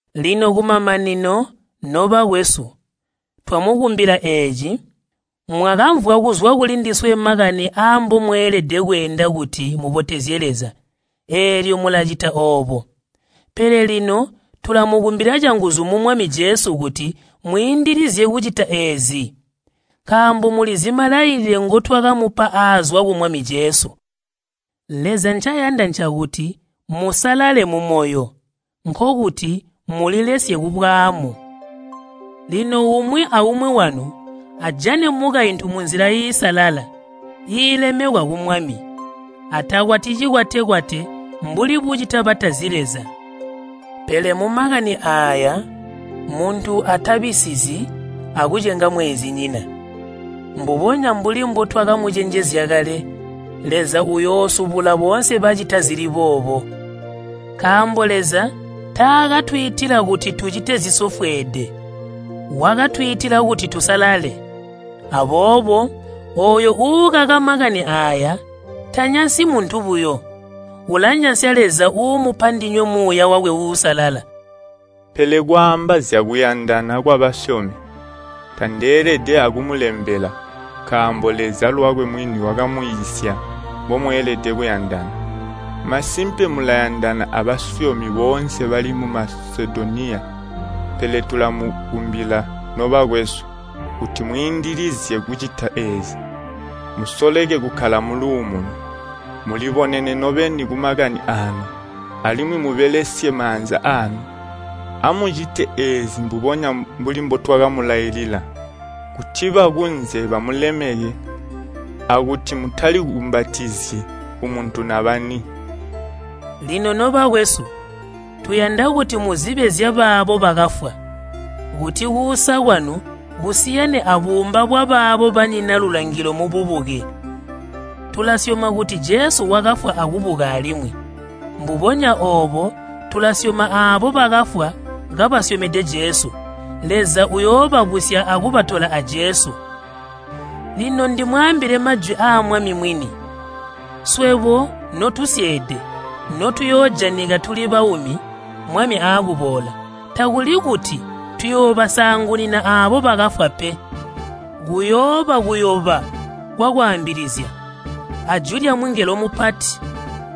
Lino kumamanino, nobakwesu twamukumbila eeci. Mwakamvwa kuzwa kulindiswe makani aambomweelede kweenda kuti mubotezye Leza, eelyo mulacita oobo. Pele lino tulamukumbila canguzu mu Mwami Jesu kuti mwiindilizye kucita eezi. Nkaambo mulizi malailile ngotwakamupa aazwa ku Mwami Jesu. Leza ncayanda ncakuti musalale mumoyo, nkokuti mulilesye kubwaamu. Lino umwi aumwi wanu ajane mukaintu munzila iisalala, iilemekwa ku Mwami. Atakwati cikwate-kwate mbuli bucita batazi Leza. Pele mumakani aaya muntu atabisizyi akucenga mweenzinyina. Mbubonya mbuli mbotwakamucenjezya kale, Leza uyoosubula boonse bacita zili boobo. Nkaambo Leza taakatwiitila kuti tucite zisofweede, wakatwiitila kuti tusalale. Aboobo ooyo uukaka makani aaya, tanyansyi muntu buyo, ulanyansya Leza uumupa ndinywe Muuya wakwe Uusalala. Pele kwaamba zyakuyandana kwabasyomi, tandeelede akumulembela, nkaambo Leza lwakwe mwini wakamwiisya mbomweelede kuyandana. Masimpe mulayandana abasyomi boonse bali mu Masedoniya. Pele tulamukumbila, nobakwesu, kuti mwiindilizye kucita eezi. Musoleke kukkala muluumuno. Mulibonene nobeni kumakani aanu, alimwi mubelesye maanza aanu. Amucite eezi mbubonya mbuli mbotwakamulailila kuti bakunze bamulemeke akuti mutali kumbatizyi kumuntu nabani. Lino, nobakwesu, tuyanda kuti muzibe zyabaabo bakafwa, kuti kuusa kwanu kusiyane abuumba bwabaabo banyina lulangilo mububuke. Tulasyoma kuti Jesu wakafwa akubuka alimwi. Mbubonya oobo tulasyoma aabo bakafwa kabasyomede Jesu, Leza uyoobabusya akubatola a Jesu. Lino ndimwaambile majwi aa Mwami mwini. Swebo notusyeede notuyoojanika tuli baumi Mwami aakuboola, takuli kuti tuyoobasaangunina aabo bakafwa pe. Kuyooba kuyoba kwakwaambilizya, ajwi lyamungelo mupati,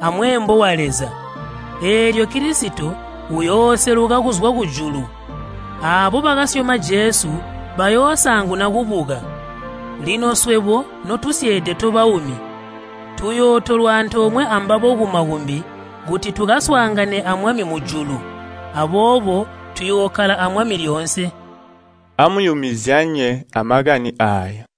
amweembo wa Leza, eelyo Kilisito uyooseluka kuzwa kujulu. Aabo bakasyoma Jesu bayoosaanguna kubuka. Lino swebo notusyeede tobaumi tuyootolwa antoomwe ambabo kumakumbi kuti tukaswaangane a Mwami mujulu. Aboobo tuyookkala a Mwami lyoonse. Amuyumizyanye amakani aaya.